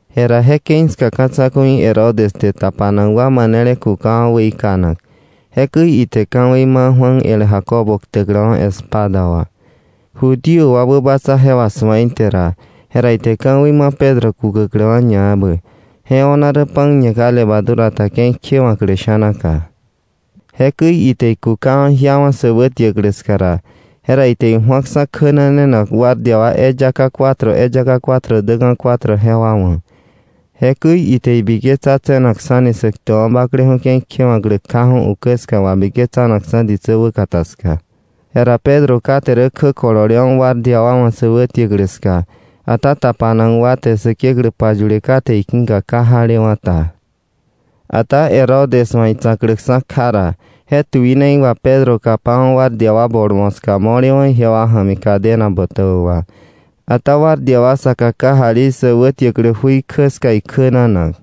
Jera je ke̱i ska ka̱ tsa̱ku̱i Herodes te tapanak wa manele kukawa̱ weikanak. Jekäi ite ka̱wei ma Juan el Jacobo ktäkläwa̱ espada wà. Judío wa wäbatsa je wà su̱a ite ra, jera ite ka̱wei ma Pedro kukäkläwa̱ ñaebä. Je o̱na rä pan ñe ka levadura ta ke̱i kjewa̱klä sha̱naka. Jekäi ite ikukawa̱ jiawa̱ sä wätiäklä ska ra, jera ite iju̱aksa̱ kjänanenak guardia wa eyaka cuatro eyaka cuatro däka̱ cuatro jewa wa̱. Jekäi ite ibiketsa tse̱nakksa̱ni Säktäkwa̱ Bakleju̱ ke̱i kjewa̱klä kjaju̱ ukä ska wabiketsanakksa̱ ditsä wäkata ska. Jera Pedro kate rä kjä kololewa̱ guardia wa wa̱ sä wätiäklä ska, ata tapanak wa te Säkeklä payule kate iki̱ka ka jalewa̱ta. Ata Herodes wa̱ itsa̱kläksa̱ kja ra, je tuinei wà Pedro kapawa̱ guardia wa bol moska mo̱lewa̱ ijewa ja̱mi cadena botäbä wà. Ata guardia wa saka kajali sä wätiäklä jui kjä ska ikjänanak.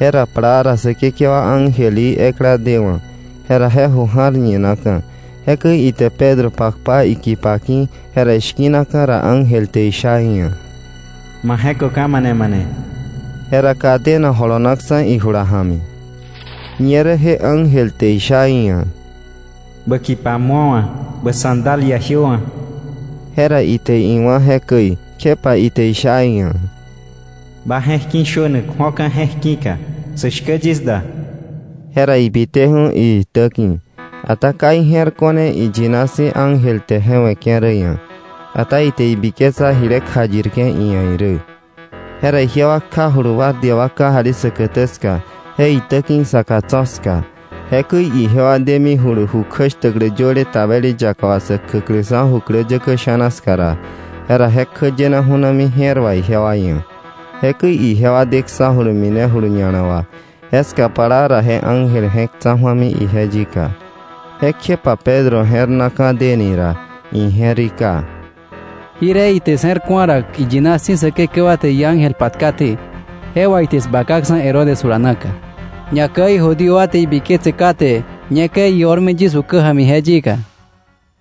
Jera plaa ra Säkekewa ángel í ekla dewa̱, jera je jui ja̱r ñinaka̱. Jekäi ije te Pedro pakpa ikipa ki̱, jera ishki̱naka̱ ra ángel te isha iia̱: “Ma je̱köka̱ mane mane.” Jera cadena jolonaksa̱ ijula ja̱mi. Ñerä je ángel te isha iia̱: “Bä kipa mu̱owa̱, bä sandalia jiöwa̱.” Jera ite iwá̱ jekäi, kjepa ite isha iia̱: “Ba je̱k ki̱ shönak ju̱oka̱ je̱k ki̱ka. Sä shkä yis da.” Jera ibiteju̱ iitäki̱. Ata ka ije̱r ko̱ne iyina si̱ ángel te je we̱ke̱ rä ia̱. Ata ite ibiketsa jile kjayirke̱ iia̱ irä. Jera ijewa kjajulu guardia wa kajali säkätä ska, je itäki̱ isaka tso̱ ska. Jekäi ijewa demijulu ju kjäshtäklä yöle tabeli yaka wà sä kjäkläksa̱ju̱ jukläyäkä sha̱na ska ra, jera je kjäyena ju̱nami je̱r wà ijewa ia̱. Jekäi ijewa deksa̱julu minejulu ña̱la wà. Jeska plaa ra je ángel je̱k tsa̱ju̱ami ije yika. Jekjepa Pedro je̱r na ka̱ deni ra, ije̱rika: “Jirje ite 'sje̱r ku̱a ra, iyina si̱ Säkekewa te iángel patkaté, je wà ite 'sbakaksa̱ Herodes jula naka, ñakäi Judío wa te ibiketse kate ñekäi io̱rmi yis ukä ja̱mi je yika.”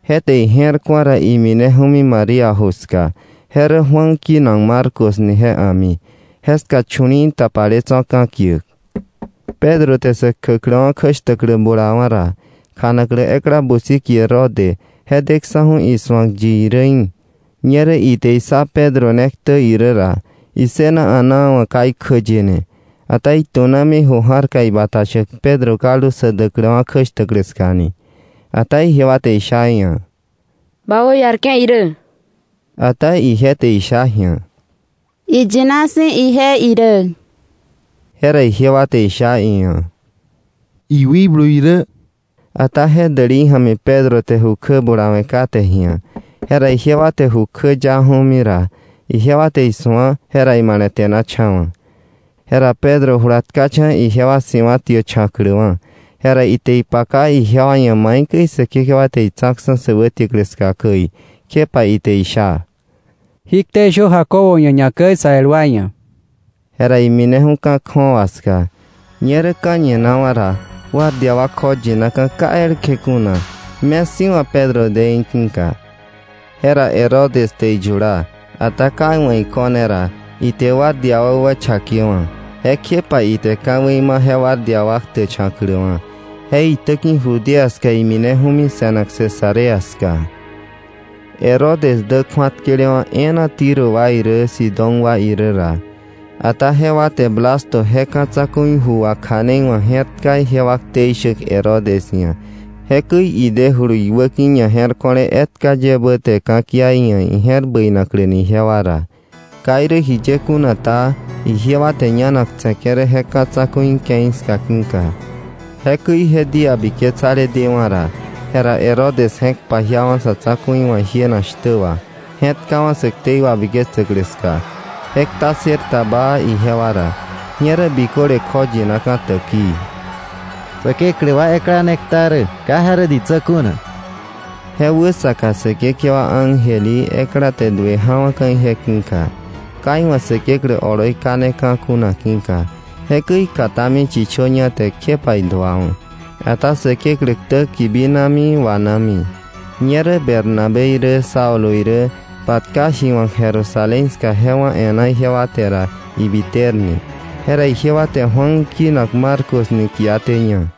Je te ije̱r ku̱a ra, imineju̱mi María ju ska. Je rä Juan kinak Marcos ni je a̱mi. Jeska chu̱li̱i̱ tapale tso̱ ka̱kiäk. Pedro te sä kjäkläwa̱ kjäshtäklä bulawa̱ ra, kjanaklä ekla busi kie Rode, je deksa̱ju̱ isu̱ak yi irä í̱. Ñerä ite issá Pedro ne ktä irä ra, issëna a̱naa wa̱ ka ikjäyene, ata itu̱namini ju ja̱rka ibata shäk Pedro kaldu sä däkläwa̱ kjäshtäklä ska ni. Ata ijewa te isha iia̱: —¡Ba wäiarke̱ irä! Ata ije te isha ji̱a: —Iyina si̱ ije irä. Jera ijewa te isha iia̱: —Iwikblu irä. Ata je dälei ja̱mi Pedro te ju kjä bulawe̱ kate ji̱a. Jera ijewa te ju kjäyaju̱mi ra, ijewa te ije isu̱a, jera imale̱te̱nacha̱wa̱. Jera Pedro jula tkacha̱ ijewa si̱wa̱tiächa̱kläwa̱. Jera ite ipaka ijewa ia̱ maikäi Säkekewa te itsa̱ksa̱ sä wätiäklä ska käi, kjepa ite isha: —Jí ktei shö Jacobo ia̱, ñakäi sä el wa ia̱. Jera imineju̱ ka̱ kju̱awa ska. Ñerä ka̱ñinawa̱ ra guardia wa kjoyinaka̱ ka elkje kuna me sí̱wa̱ Pedro de í̱ ki̱ka. Jera Herodes te iyula, ata ka iwa̱ iko̱ne ra, ite guardia wa wächakewa̱. Jekjepa ite ka̱wei ma je guardia wa ktächa̱kläwa̱. Je itäki̱ Judea ska imineju̱mi se̱nak Cesarea ska. Herodes dä kju̱atkelewa̱ e̱e̱na Tiro wa irä Sidón wa irä ra. Ata jewa te Blasto je ka̱ tsa̱ku̱i ju wakja̱neiwa̱k je̱rtka ijewa ktei shäk Herodes ia̱, jekäi idejulu iwäki̱ ñaje̱rko̱le etka ye ebä te ka̱kia iia̱ ije̱r bäinakläni ijewa ra. Ka irä jiye kuna ta, ijewa te ñanak tse̱ke̱ rä je ka̱ tsa̱ku̱i ke̱i ska ki̱ka. Jekäi je día biketsale dewa̱ ra, jera Herodes je̱k pajiawa̱ sa̱ tsa̱ku̱i wa̱ jienak shtä wa, je̱tkawa̱ sä ktei wabiketsäklä ska. Je kta ssër ta baa ijewa ra. Ñerä biköle kjoyinaka̱ täkii: “Säkeklä wa ekla ne kta rä, ka je rä ditsä kuna.” Je wäsaka Säkekewa ángel í ekla te duë ja̱wa̱ka̱ ije ki̱ka, ka iwa̱ Säkeklä oloi kaneka̱ kuna ki̱ka. Jekäi ikatami chichöña te, kjepa iduawa̱. Ata Säkeklä ktä kibinami wanami. Ñerä Bernabé irä Saulo irä patka ji wa̱k Jerusalén ska je wá̱ e̱ná ijewa te ra ibiterne. Jera ijewa te Juan kinak Marcos ni kiatéña.